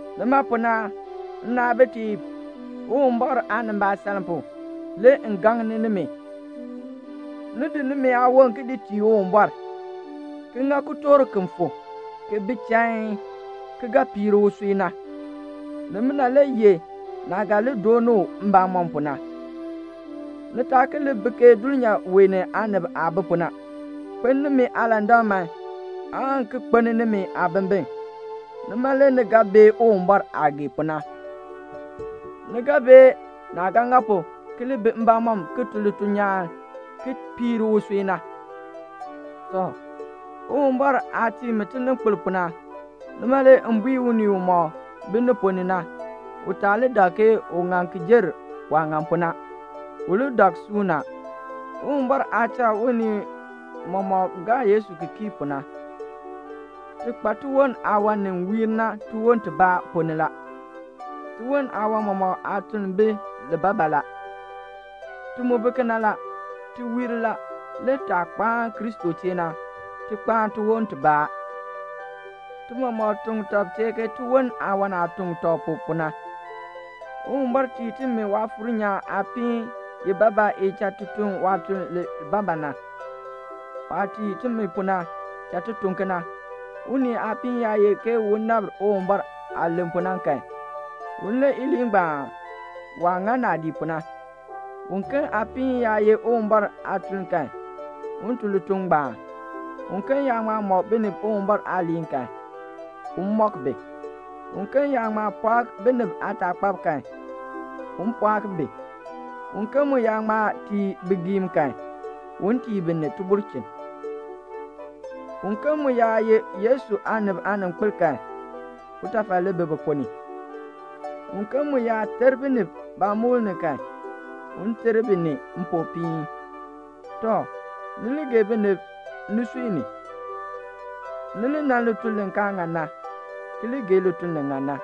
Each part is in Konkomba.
Nima pu na, nnaabitiib, Uwumbɔr aanimbaasaln pu, le m gaŋ nimi, ni di nimi aawon ki di tii Uwumbɔr, ki ŋa kitork ki fu, ki bi chain, ki ga piir usui na. Nimina le ye naah ga li doon u mbamɔm pu na. Ni taa ki li bi ke dulnyaa wee ni aanib aah bi pu na. Kpeln nimi aalandak man aan ki kpeln nimi aabimbin. Nima le ni ga bee Uwumbɔr aah gee pu na. Ni ga bee naah ga ŋa pu ki li bi mbamɔm ki tun lituln nyaan ki piir usui na. Tɔ, Uwumbɔr aah tii mi tininkpil pu na, nima le m bui unii umɔk bi ni ponn ni na, u taa li dak ke u ŋan ki jer waah ŋan pu na. U li dak suuna, Uwumbɔr aah cha unii mɔmɔk gaa Yesu ki kii pu na. Ti kpa tiwon aawan ni wiir na tiwon tibaa ponn ni la. Tiwon aawan mɔmɔk aatuln bi libaa libaa la. Ti mu bi kena la. Ti wiir la; le taah kpaan Kristo chee na, ti kpaan tiwon tibaa. Ti mɔmɔk tuŋ tɔb chee ke tiwon aawan aah tuŋ tɔb pu, pu na. Uwumbɔr tii timi Waafuur nyaan aapiin ibaabaa i cha ti tun waatuln libaabaa. Waah tii timi pu na, cha ti tun kena. Unii aapiin yaa ye ke un nabr Uwumbɔr aah len pu na kan, un len iliin ngbaan waah ŋa naadii pu na. Uken aapiin yaa ye Uwumbɔr aatuln kan, un tun lituln ngbaan. Uken yaa ŋma mɔk binib Uwumbɔr aaliin kan, un mɔk bi. Uken yaa ŋma pɔɔk binib aataakpab kan, un pɔɔk bi. Uken mu yaa ŋma tii bigiim kan, un tii bi ni tibulchin. Uken mu yaa ye Yesu aanib aaninkpil kan, utafal li bi bi ponn ni. Uken mu yaa ter binib baamukl ni kan, un ter bi ni mpopiin. Tɔ, ni li gee binib nisui ni. Ni li nan lituln li kaa ŋan na, ki li gee lituln li ŋan na.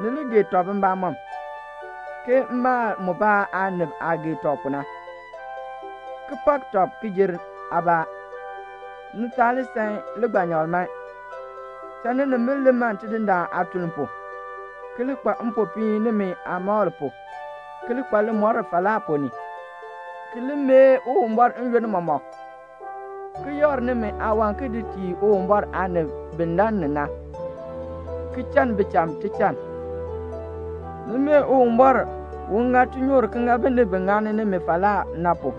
Ni li gee tɔb mbamɔm, ke maal mubaa aanib aah gee tɔb pu na, ki pak tɔb ki jer aabaa. Ni taa li san ligbanyakl man. Cha ninimbil li man Tidindaan aatuln pu, ki li kpa mpopiin nimi aamakl pu, ki li kpa limɔr falaa ponn ni, ki li mee Uwumbɔr n-yoonn mɔmɔk, ki yakr nimi aawan ki di tii Uwumbɔr aanib bi lann ni na, ki chann bicham tichann. Ni mee Uwumbɔr un ŋa tinyoor ki ŋa binib bi ŋani nimi falaa na pu.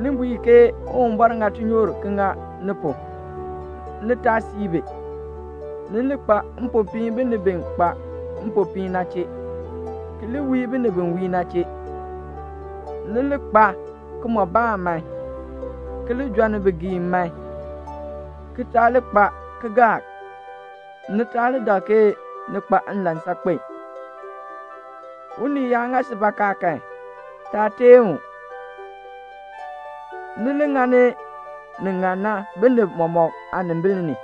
Ni bui bi ke "Uwumbɔr ŋa tinyoor ki ŋa ni pu." Ni taa sii bi. Ni li kpa mpopiin binib bi kpa mpopiin na chee, ki li wii binib bi wii na chee. Ni li kpaa kimɔbaan man. Ni li jɔnni bigiim man, ki taa li kpa kalmbaani. Ni taa li dak ke ni kpa nlan saakpen. Unii yaa ŋa si bakaa kan, taa teen u. Ni li ŋani ni ŋan na binib mɔmɔk aanimbil ni.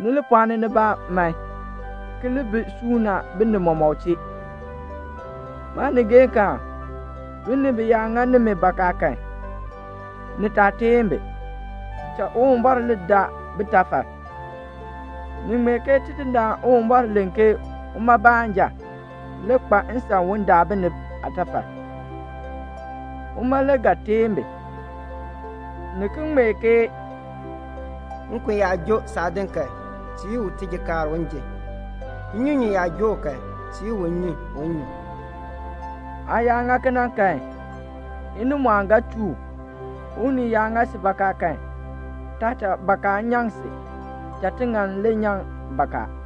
Ni li pɔɔni nibaa man, ki li bi suuna binib mɔmɔk chee. Maanigeekaan, binib yaa ŋa nimi bakaa kan, ni taa teen bi. Cha Uwumbɔr li daa bitafal. Ni ŋmee ke Tidindaan Uwumbɔr len ke uma baanja le kpa nsan un dar binib aatafal. Uma le ga teen bi. Ni ki ŋmee ke "Nkon yaa joo saadin kan, tii u tijikaar un ji. Nnyunyun yaa joo u kan, tii u nnyun un nyun." Aa yaa ŋa kena kan, inimɔɔn ga chuu u. Unii yaa ŋa si bakaa kan, taa cha bakaa ngbaan nyaŋ si. Cha tiŋann le nyaŋ bakaa.